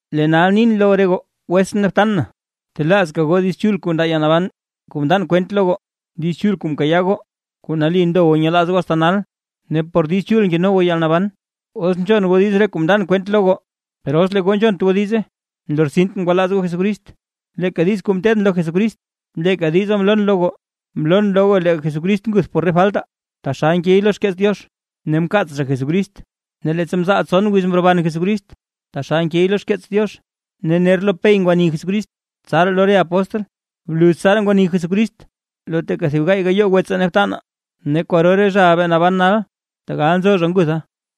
Lee nal nin lo re goo wetsʼn ne btan na, btelaazka goo Diiz Chul kuu ndaa yalnaban kuu mndan kwent lo goo. Diiz Chul kuu mkayaa goo, kuu nali ndo goo nyelaaz goo asta nal. Ne por Diiz Chul keno goo yalnaban, os nzhon goo diiz re kuu mndan kwent lo goo; per os lee goo nzhont goo diize, nlortsint ngwalaaz goo Jesucrist. Leeka diiz kuu mteedʼn lo Jesucrist, leeka diza mloon lo goo. Mloon lo goo lee Jesucrist nguth por re faltaa, taxal nkey lo xkeets Diox, ne mkaats zha Jesucrist, ne leettsa mzaal tson wiz mroban Jesucrist, taxal nkey lo xkeets Diox; ne ner lo Pey ngwani Jesucrist, tsaraa lo re apóstl. Bluz tsaraa ngwani Jesucrist lo teeka thib gaay gayoo wetsaa ne btanaa, ne kwaro re zhaʼa bee naban nal, tegal nzo zha ngutha.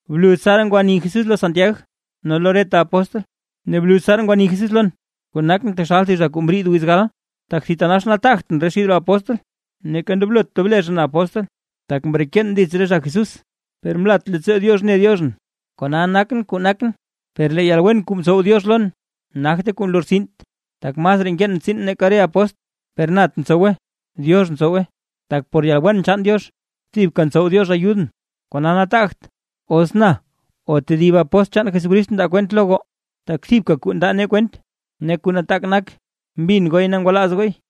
Bluz tsaraa ngwani Jesús lo Santiag ne lo reta apóstl. Ne bluz tsaraa ngwani Jesús lon, kuu nakʼn taxal thib zha kuu mriid wiz gal. Tak thitanax nataagtʼn xid re apóstl, neeka ndoblot tob le zha na apóstl, tak mreken dits re zha Jesús. Per mlat leettsoo Diox ne Diox na, kona nakʼn kuu nakʼn, per lee yalwen kuu mtsow Diox lon nagte kuu nlortsint, tak masraa nkeen tsiin nake re apóstl, per nat ntsowe Diox ntsowe, tak por yalwen chaan Diox thibka ntsow Diox ayudʼn. Kona nataagt os na o tedib apóstl chaan Jesucrist mndaa kwent lo goo, tak thibka kuu ndaa nee kwent ne kuu nataak nak mbin gooy ne ngwalaaz gooy.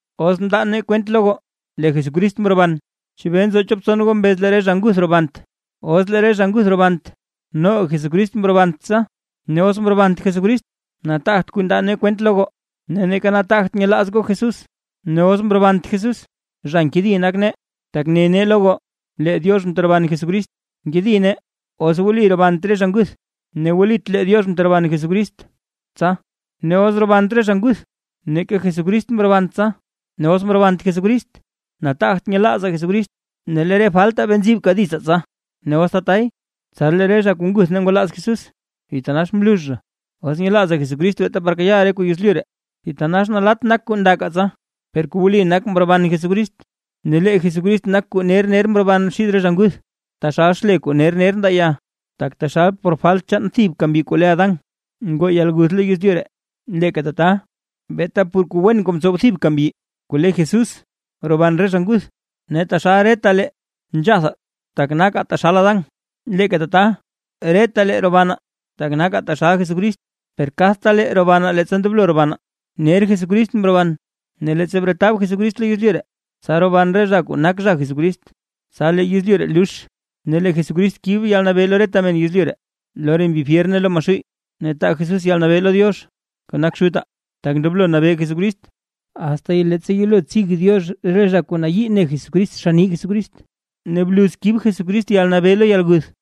Os mndaa nee kwent lo goo lee Jesucrist mroban. ¿Chebee nzo chop tson goo mbez lee re zha nguth robant? Os lee re zha nguth robant, noga Jesucrist mrobant tsa. Ne os mrobant Jesucrist, nataagt kuu ndaa nee kwent lo goo, ne neeka nataagt nyelaaz goo Jesús. Ne os mrobant Jesús zha nkedi nak nee, tak ne nee lo goo lee Diox mteroban Jesucrist; nkedi nee os wli robant re zha nguth, ne wlit lee Diox mteroban Jesucrist tsa. Ne os robant re zha nguth, neeka Jesucrist mrobant tsa; ne os mrobant Jesucrist, nataagt nyelaazaa Jesucrist ne lee re faltaa bee nzibka ditsaa tsa. Ne os tatay, tsa lee re zha kuu nguth ne ngwalaaz Jesús, thitanax mlux zha. Os nyelaazaa Jesucrist beeta par kayaaʼaa re kuu yezlyu ree, thitanax nalatt nak kuu ndakaa tsa. Per kuu wli nak mroban Jesucrist; ne lee Jesucrist nak zha kuu ner ner mroban xid re zha nguth, taxal xle kuu ner ner ndaa ya. Tak taxal por falt chaan thibka mbyi kuu le Adán, ngoo yalguth lo yezlyu ree; leeka tata beeta por kuu wen kuu mtsow thibka mbyi kuu le Jesús, roban re zha nguth. Ne taxal retalee nzhathaa tak nakaa taxal Adán, leeka tata retalee robanaa tak nakaa taxal Jesucrist. Per kadta lee robanaa leettsa ndoblo robanaa; ner Jesucrist mroban, ne leettsa bretab Jesucrist lo yezlyu ree, tsa roban re zha kuu nak zha Jesucrist. Tsa lee yezlyu ree lux, ne lee Jesucrist kib yalnabee lo reta men yezlyu ree, lo re mbi fyer ne lo Maxuuy, ne taa Jesús yalnabee lo Diox kuu nak Xutaa. Tak ndoblo nabee Jesucrist, asta leettsa yelo tsig Diox re zha kuu nayii ne Jesucrist xann nii Jesucrist; ne bluz kib Jesucrist yalnabee lo yalguth.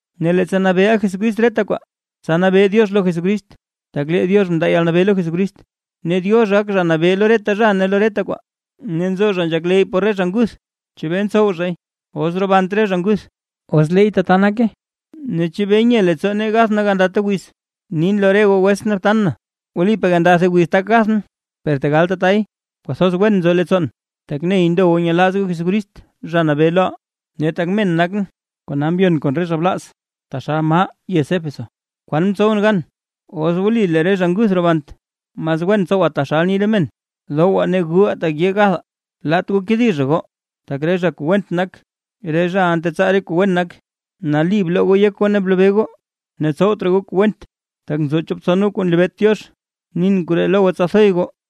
Ne leettsa nabeeʼa Jesucrist reta kwaa, tsa nabee Diox lo Jesucrist. Tak lee Diox mndaa yalnabee lo Jesucrist, ne Diox gak Zha Nabee lo reta zha ne reta kwaa. Ne nzo zha nzhakleyy por re zha nguth. ¿Chebee ntsow zhay? Os robant re zha nguth. Os leey tata nake, ¿chebee nye leettsoo nee gath nee gandata wiz? Nin lo re goo wetsʼn ne btan na, wlipaa gandata wiz tak gathʼn. Per tegal tatay, kwathoz wen nzo leettsoon, tak ney ndo goo nyelaaz goo Jesucrist, Zha Nabee loʼaa. Ne tak men nakʼn, kona mbyon kon re zha blaaz taxal maa yez Éfeso, ¿kwan mtsowʼn gan? Os wli lee re zha nguth robant, mas wen tsowaa taxal ni re men: “Dowaa ne guʼaa tak yee gathaa”. Laat goo kedi zha goo. Tak re zha kuu went nak, re zhaʼa ntetsaa re zha kuu wen nak. Nali bloo goo yek goo ne blobee goo, ne tsowt raa goo re kuu went, tak nzo chop tson goo kuu nlebeet Diox. Nin koree lo goo tsa thoy goo.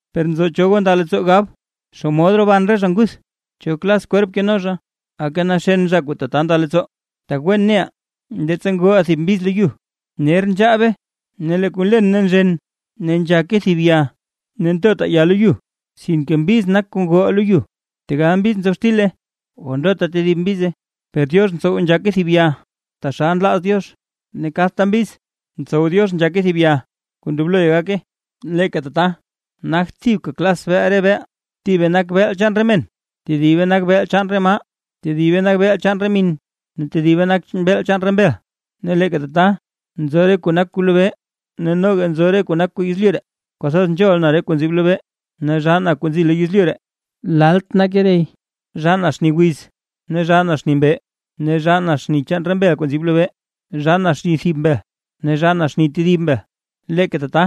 Per nzo cho goo nda leettsoo gab: “¿Xomod roban re zha nguth? ¿Cho klas kwerp keno zha?” Aka naxen zha kuu tata nda leettsoo, tak wen neʼaa leettsa ngoʼaa thib mbiz lo yu, ner nzhaabe ne lee kuu nlen nzhene ne nzhake thib ya. Ne ntotaa ya lo yu, sinke mbiz nak kuu ngoʼaa lo yu, tegal mbiz nzob xtile o ndota tedib mbize. Per Diox ntsow nzhake thib ya taxal nlaaz Diox, ne kadta mbiz ntsow Diox nzhake thib ya kuu ndobloy gake. Leeka tata, nagt thibka klas beel re beel, thibe nak beel chaan men, tedibe nak beel chaan re maa, tedibe nak beel chaan re min ne tedibe nak beel chaan re mbel. Ne leeka tata, nzo re kuu nak kuu lobee, ne noga nzo re kuu nak kuu yezlyu ree. Kwathoz nzhol na re kuu nzib lobee ne zhaa na kuu nzi yezlyu ree lalt nake rey. Zhaa na xni wiz ne zhaa na xni mbee; ne zhaa na xni chaan re mbel kuu nzib lobee, zhaa na xni thib mbel ne zhaa na xni tedib mbel. Ne leeka tata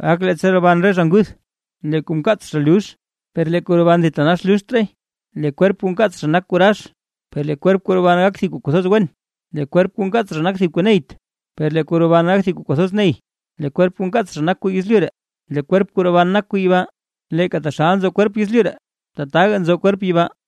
gak leettsa roban re zha nguth. Lee kuu nkaats zha lux, per lee kuu roban thitanax luxt raay. Lee kwerp kuu nkaats zha nak kuu rax, per lee kwerp kuu roban gak thib kuu kwathoz wen. Lee kwerp kuu nkaats zha nak thib kuu neyt, per lee kuu roban gak thib kuu kwathoz ney. Lee kwerp kuu nkaats zha nak kuu yezlyu ree, lee kwerp kuu roban nak kuu yibaa. Leeka taxal nzo kwerp yezlyu ree, tataka nzo kwerp yibaa.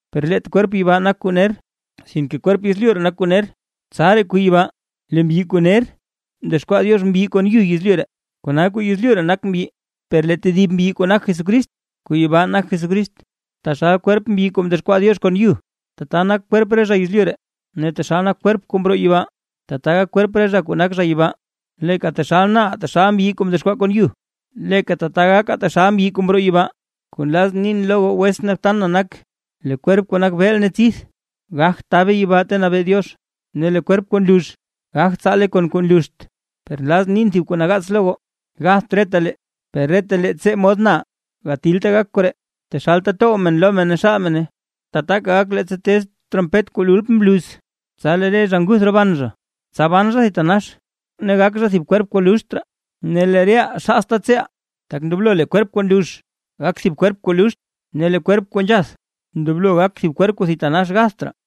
Per leet kwerp yibaa nak kuu ner, sinke kwerp yezlyu ree nak kuu ner; tsaraa kuu yibaa. Lee mbyi kuu ner mdexkwaa Diox mbyi kon yu yezlyu ree, kona kuu yezlyu ree nak mbyi, per lee tedib mbyi kuu nak Jesucrist kuu yibaa nak Jesucrist. Taxal kwerp mbyi kuu mdexkwaa Diox kon yu, tata nak kwerp re zha yezlyu ree; ne taxal nak kwerp zha kuu mroo yibaa, tata gak kwerp re zha kuu nak zha yibaa. Leeka taxal na reʼaa taxal mbyi kuu mdexkwaa kon yu, leeka tata gakaa taxal mbyi kuu mroo yibaa. Kuu nlazʼn nin lo goo wetsʼn ne btan na nak, lee kwerp kuu nak beel ne tsidth, gagt tabe yibaa ta nabee Diox, ne lee kwerp kuu nlux gagt tsaale kon kuu nluxt. Per nlazʼn nin thib kuu nagaats lo goo: Gatht retalee per retalee tsee mod na reʼaa, gatilta gak koree, taxalta tow men lo men ne xaal mene, tata gak leettsa tez trompet kuu lultm bluz, tsa lee re zha nguth roban zha, tsa ban zha thitanax, ne gak zha thib kwerp kuu luxt raa, ne lee reʼaa xaasta tseeʼaa. Tak ndoblo lee kwerp kuu nlux gak thib kwerp kuu luxt; ne lee kwerp kuu nzhath ndoblo gak thib kwerp kuu thitanax gatht raa.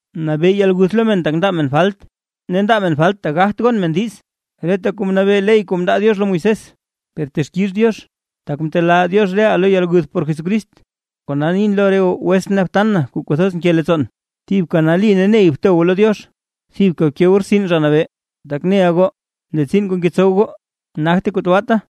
Nabee yalguth lo men tak ndaa men falt, ne ndaa men falt tak gagt gon men diiz, reta kuu nabee ley kuu mndaa Diox lo Moisés. ¡Per texkix Diox, tak mtelaa Diox reʼaa lo yalguth por Jesucrist! Kona nin lo re goo wetsʼn ne btan na kuu kwathoz nke leettsoon, thibka nali ne ney bto goo lo Diox, thibka bke goo rtsin Zha Nabee; tak neʼa goo lee tsiin kuu ngetsow goo nagte kuu tabaata.